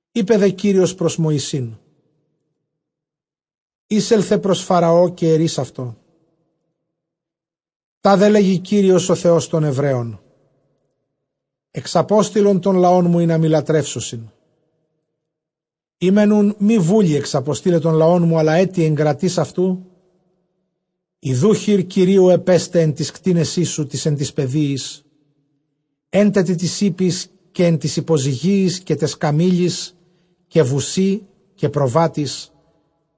Εἶπε δὲ Κύριος πρὸς Μωυσῆν, εἴσελθε πρὸς Φαραὼ, καὶ ἐρεῖς αὐτῷ, τάδε λέγει Κύριος ὁ Θεὸς τῶν Ἑβραίων, ἐξαπόστειλον τὸν λαόν μου, ἵνα μοι λατρεύσωσι. Εἰ μὲν οὖν μὴ βούλει ἐξαποστεῖλαι τὸν λαόν μου, ἀλλὰ ἔτι ἐγκρατεῖς αὐτοῦ, Ἰδοὺ, χεὶρ Κυρίου ἐπέσται ἐν τοῖς κτήνεσί σου τοῖς ἐν τοῖς πεδίοις, ἔν τε τοῖς ἵπποις, καὶ ἐν τοῖς ὑποζυγίοις, καὶ ταῖς καμήλοις, καὶ βουσὶ, καὶ προβάτοις,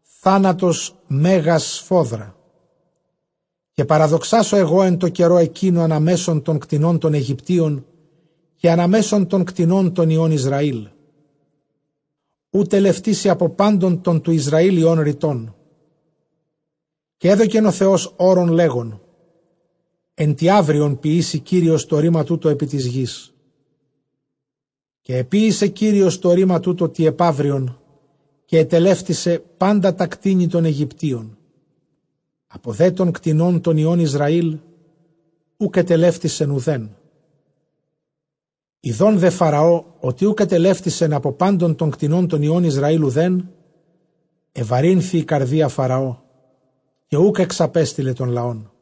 θάνατος μέγας σφόδρα. Καὶ παραδοξάσω ἐγὼ ἐν τῷ καιρῷ ἐκείνῳ ἀνὰ μέσον τῶν κτηνῶν τῶν Αἰγυπτίων, καὶ ἀνὰ μέσον τῶν κτηνῶν τῶν υἱῶν Ἰσραήλ· οὐ τελευτήσει ἀπὸ πάντων τῶν τοῦ Ἰσραὴλ υἱῶν ῥητόν. Καὶ ἔδωκεν ὁ Θεὸς ὅρον, λέγων, ἐν τῇ αὔριον ποιήσει Κύριος τὸ ῥῆμα τοῦτο ἐπὶ τῆς γῆς. Καὶ ἐποίησε Κύριος τὸ ῥῆμα τοῦτο τῇ ἐπαύριον· καὶ ἐτελεύτησε πάντα τὰ κτήνη τῶν Αἰγυπτίων· ἀπὸ δὲ τῶν κτηνῶν τῶν υἱῶν Ἰσραὴλ οὐκ ἐτελεύτησεν οὐδέν. Ἰδὼν δὲ Φαραὼ ὅτι οὐκ ἐτελεύτησεν ἀπὸ πάντων τῶν κτηνῶν τῶν υἱῶν Ἰσραὴλ οὐδὲν, ἐβαρύνθη ἡ καρδία Φαραὼ, καὶ οὐκ ἐξαπέστειλε τὸν λαόν.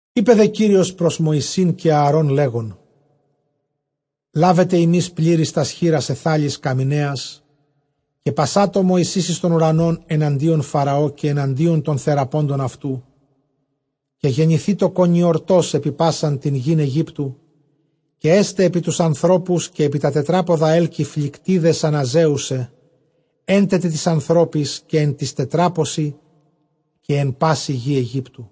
Εἶπε δὲ Κύριος πρὸς Μωυσῆν καὶ Ἀαρὼν, λέγων, λάβετε ὑμεῖς πληρεῖς τὰς χεῖρας αἰθάλης καμιναίας, καὶ πασάτω Μωυσῆς εἰς τὸν οὐρανὸν ἐναντίον Φαραὼ, καὶ ἐναντίον τῶν θεραπόντων αὐτοῦ. Καὶ γενηθήτω κονιορτὸς ἐπὶ πᾶσαν τὴν γῆν Αἰγύπτου· καὶ ἔσται ἐπὶ τοὺς ἀνθρώπους, καὶ ἐπὶ τὰ τετράποδα, ἕλκη, φλυκτίδες ἀναζέουσαι ἔν τε τοῖς ἀνθρώποις, καὶ ἐν τοῖς τετράποσιν, ἐν πάσῃ γῇ Αἰγύπτου.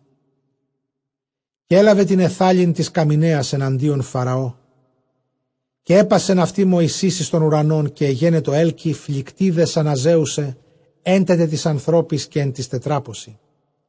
Καὶ ἔλαβεν τὴν αἰθάλην τῆς καμιναίας ἐναντίον Φαραὼ, καὶ ἔπασεν αὐτὴν Μωυσῆς εἰς τὸν οὐρανόν· καὶ ἐγένετο ἕλκη, φλυκτίδες ἀναζέουσαι, ἔν τε τοῖς ἀνθρώποις, καὶ ἐν τοῖς τετράποσι.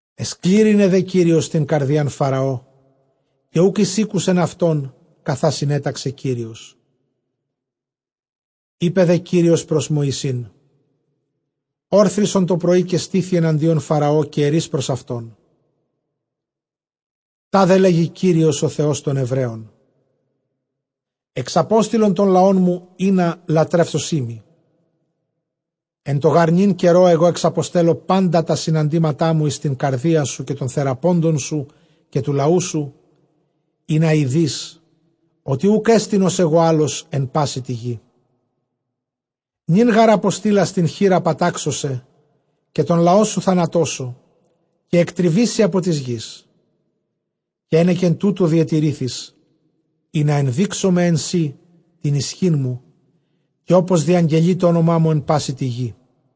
Ἐσκλήρυνε δὲ Κύριος τὴν καρδίαν Φαραὼ, καὶ οὐκ εἰσήκουσεν αὐτῶν, καθὰ συνέταξε Κύριος. Εἶπε δὲ Κύριος πρὸς Μωυσῆν, ὄρθρισον τὸ πρωῒ, καὶ στῆθι ἐναντίον Φαραὼ, καὶ ἐρεῖς πρὸς αὐτὸν, τάδε λέγει Κύριος ὁ Θεὸς τῶν Ἑβραίων, ἐξαπόστειλον τὸν λαόν μου, ἵνα λατρεύσωσί μοι. Ἐν τῷ γὰρ νῦν καιρῷ ἐγὼ ἐξαποστέλλω πάντα τὰ συναντήματά μου εἰς τὴν καρδίαν σου, καὶ τῶν θεραπόντων σου, καὶ τοῦ λαοῦ σου, ἵνα εἴδῇς ὅτι οὐκ ἔστιν, ὡς ἐγὼ, ἄλλος ἐν πάσῃ τῇ γῇ. Νῦν γὰρ ἀποστείλας τὴν χεῖρα πατάξω σε, καὶ τὸν λαόν σου θανατώσω, καὶ ἐκτριβήσῃ ἀπὸ τῆς γῆς. Καὶ ἕνεκεν τούτου διετηρήθης, ἵνα ἐνδείξωμαι ἐν σοὶ τὴν ἰσχύν μου, καὶ ὅπως διαγγελῇ τὸ ὄνομά μου ἐν πάσῃ τῇ γῇ.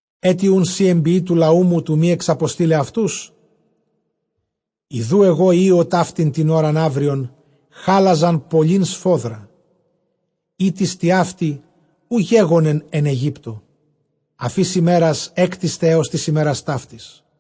Ἔτι οὖν σὺ ἐνποιῇ τοῦ λαοῦ μου, τοῦ μὴ ἐξαποστεῖλαι αὐτούς; Ἰδοὺ ἐγὼ ὕω ταύτην τὴν ὥραν αὔριον χάλαζαν πολλὴν σφόδρα, ἥτις τοιαύτη οὐ γέγονεν ἐν Αἰγύπτῳ, ἀφʼ ἧς ἡμέρας ἔκτισται, ἕως τῆς ἡμέρας ταύτης.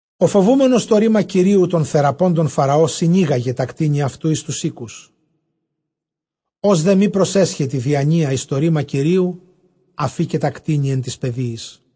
Ὁ φοβούμενος τὸ ῥῆμα Κυρίου τῶν θεραπόντων Φαραὼ, συνήγαγε τὰ κτήνη αὐτοῦ εἰς τοὺς οἴκους. Ὃς δὲ μὴ πρόσεσχεν τῇ διανοίᾳ εἰς τὸ ῥῆμα Κυρίου, ἀφῆκε τὰ κτήνη ἐν τοῖς πεδίοις.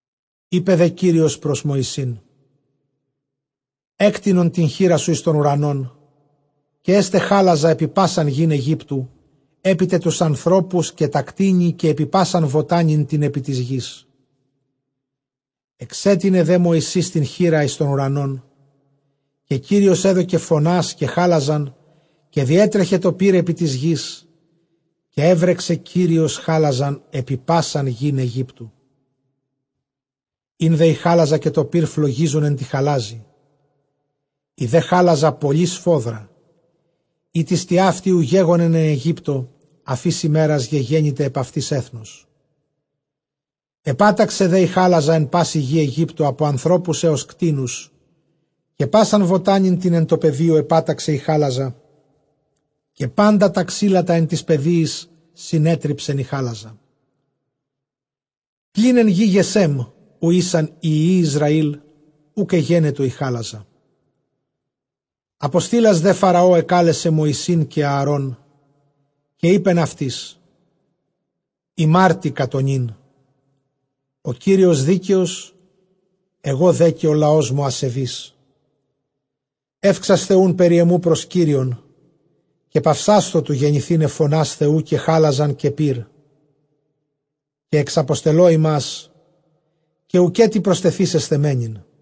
Εἶπε δὲ Κύριος πρὸς Μωυσῆν, ἔκτεινον τὴν χεῖρά σου εἰς τὸν οὐρανὸν, καὶ ἔσται χάλαζα ἐπὶ πᾶσαν γῆν Αἰγύπτου, ἐπί τε τοὺς ἀνθρώπους, καὶ τὰ κτήνη, καὶ ἐπὶ πᾶσαν βοτάνην τὴν ἐπὶ τῆς γῆς. Ἐξέτεινε δὲ Μωυσῆς τὴν χεῖρα εἰς τὸν οὐρανὸν, καὶ Κύριος ἔδωκε φωνὰς καὶ χάλαζαν· καὶ διέτρεχε τὸ πῦρ ἐπὶ τῆς γῆς· καὶ ἔβρεξε Κύριος χάλαζαν ἐπὶ πᾶσαν γῆν Αἰγύπτου. Ἦν δὲ ἡ χάλαζα καὶ τὸ πῦρ φλογίζον ἐν τῇ χαλάζῃ· ἡ δὲ χάλαζα πολλὴ σφόδρα, ἥτις τοιαύτη οὐ γέγονεν ἐν Αἰγύπτῳ, ἀφʼ ἧς ἡμέρας γεγένηται ἐπʼ αὐτῆς ἔθνος. Ἐπάταξε δὲ ἡ χάλαζα ἐν πάσῃ γῇ Αἰγύπτου, ἀπὸ ἀνθρώπου ἕως κτήνους· καὶ πᾶσαν βοτάνην τὴν ἐν τῷ πεδίῳ ἐπάταξεν ἡ χάλαζα· καὶ πάντα τὰ ξύλα τὰ ἐν τοῖς πεδίοις συνέτριψεν ἡ χάλαζα. Πλὴν ἐν γῇ Γεσὲμ, οὗ ἦσαν οἱ υἱοὶ Ἰσραὴλ, οὐκ ἐγένετο ἡ χάλαζα. Ἀποστείλας δὲ Φαραὼ ἐκάλεσε Μωυσῆν καὶ Ἀαρὼν, καὶ εἶπεν αὐτοῖς, ἡμάρτηκα τὸ νῦν· ὁ Κύριος δίκαιος, ἐγὼ δὲ καὶ ὁ λαός μου ἀσεβεῖς. Εὔξασθε οὖν περὶ ἐμοῦ πρὸς Κύριον, καὶ παυσάσθω τοῦ γενηθῆναι φωνὰς Θεοῦ, καὶ χάλαζαν, καὶ πῦρ· καὶ ἐξαποστελῶ ὑμᾶς, καὶ οὐκέτι προστεθήσεσθε μένειν.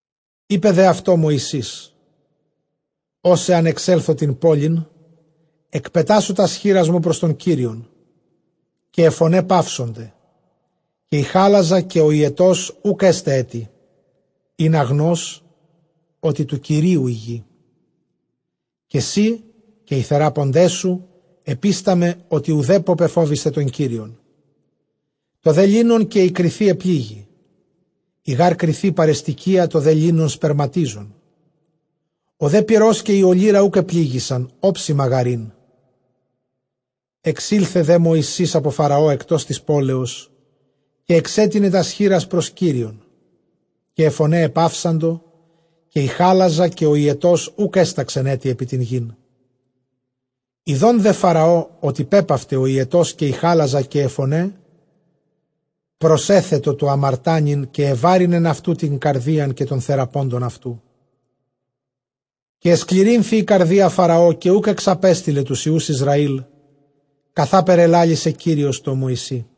Εἶπε δὲ αὐτῷ Μωυσῆς, ὡς ἂν ἐξέλθω τὴν πόλιν, ἐκπετάσω τὰς χεῖράς μου πρὸς τὸν Κύριον, καὶ αἱ φωναὶ παύσονται, καὶ ἡ χὰλαζα καὶ ὁ ὑετὸς οὐκ ἔσται ἔτι, ἵνα γνῷς ὅτι τοῦ Κυρίου ἡ γῆ. Καὶ σὺ καὶ οἱ θεράποντές σου, ἐπίσταμαι ὅτι οὐδέπω πεφόβησθε τὸν Κύριον. Τὸ δὲ λίνον καὶ ἡ κριθὴ ἐπλήγη· ἡ γὰρ κριθὴ παρεστηκυῖα, τὸ δὲ λίνον σπερματίζον. Ὁ δὲ πυρὸς καὶ ἡ ὀλύρα οὐκ ἐπληγησαν, ὄψιμα γὰρ ἦν. Ἐξῆλθε δὲ Μωυσῆς ἀπὸ Φαραὼ ἐκτὸς τῆς πόλεως, καὶ ἐξέτεινε τὰς χεῖρας πρὸς Κύριον· καὶ αἱ φωναὶ ἐπαύσαντο, καὶ ἡ χάλαζα καὶ ὁ ὑετὸς οὐκ ἔσταξεν ἔτι ἐπὶ τὴν γῆν. Ἰδὼν δὲ Φαραὼ ὅτι πέπαυται ὁ ὑετὸς καὶ ἡ χάλαζα καὶ αἱ φωναὶ, προσέθετο τοῦ ἁμαρτάνειν· καὶ ἐβάρυνεν αὐτοῦ τὴν καρδίαν, καὶ τῶν θεραπόντων αὐτοῦ. Καὶ ἐσκληρύνθη ἡ καρδία Φαραὼ, καὶ οὐκ ἐξαπέστειλε τοὺς υἱοὺς Ἰσραὴλ, καθάπερ ἐλάλησε Κύριος τῷ Μωυσῇ.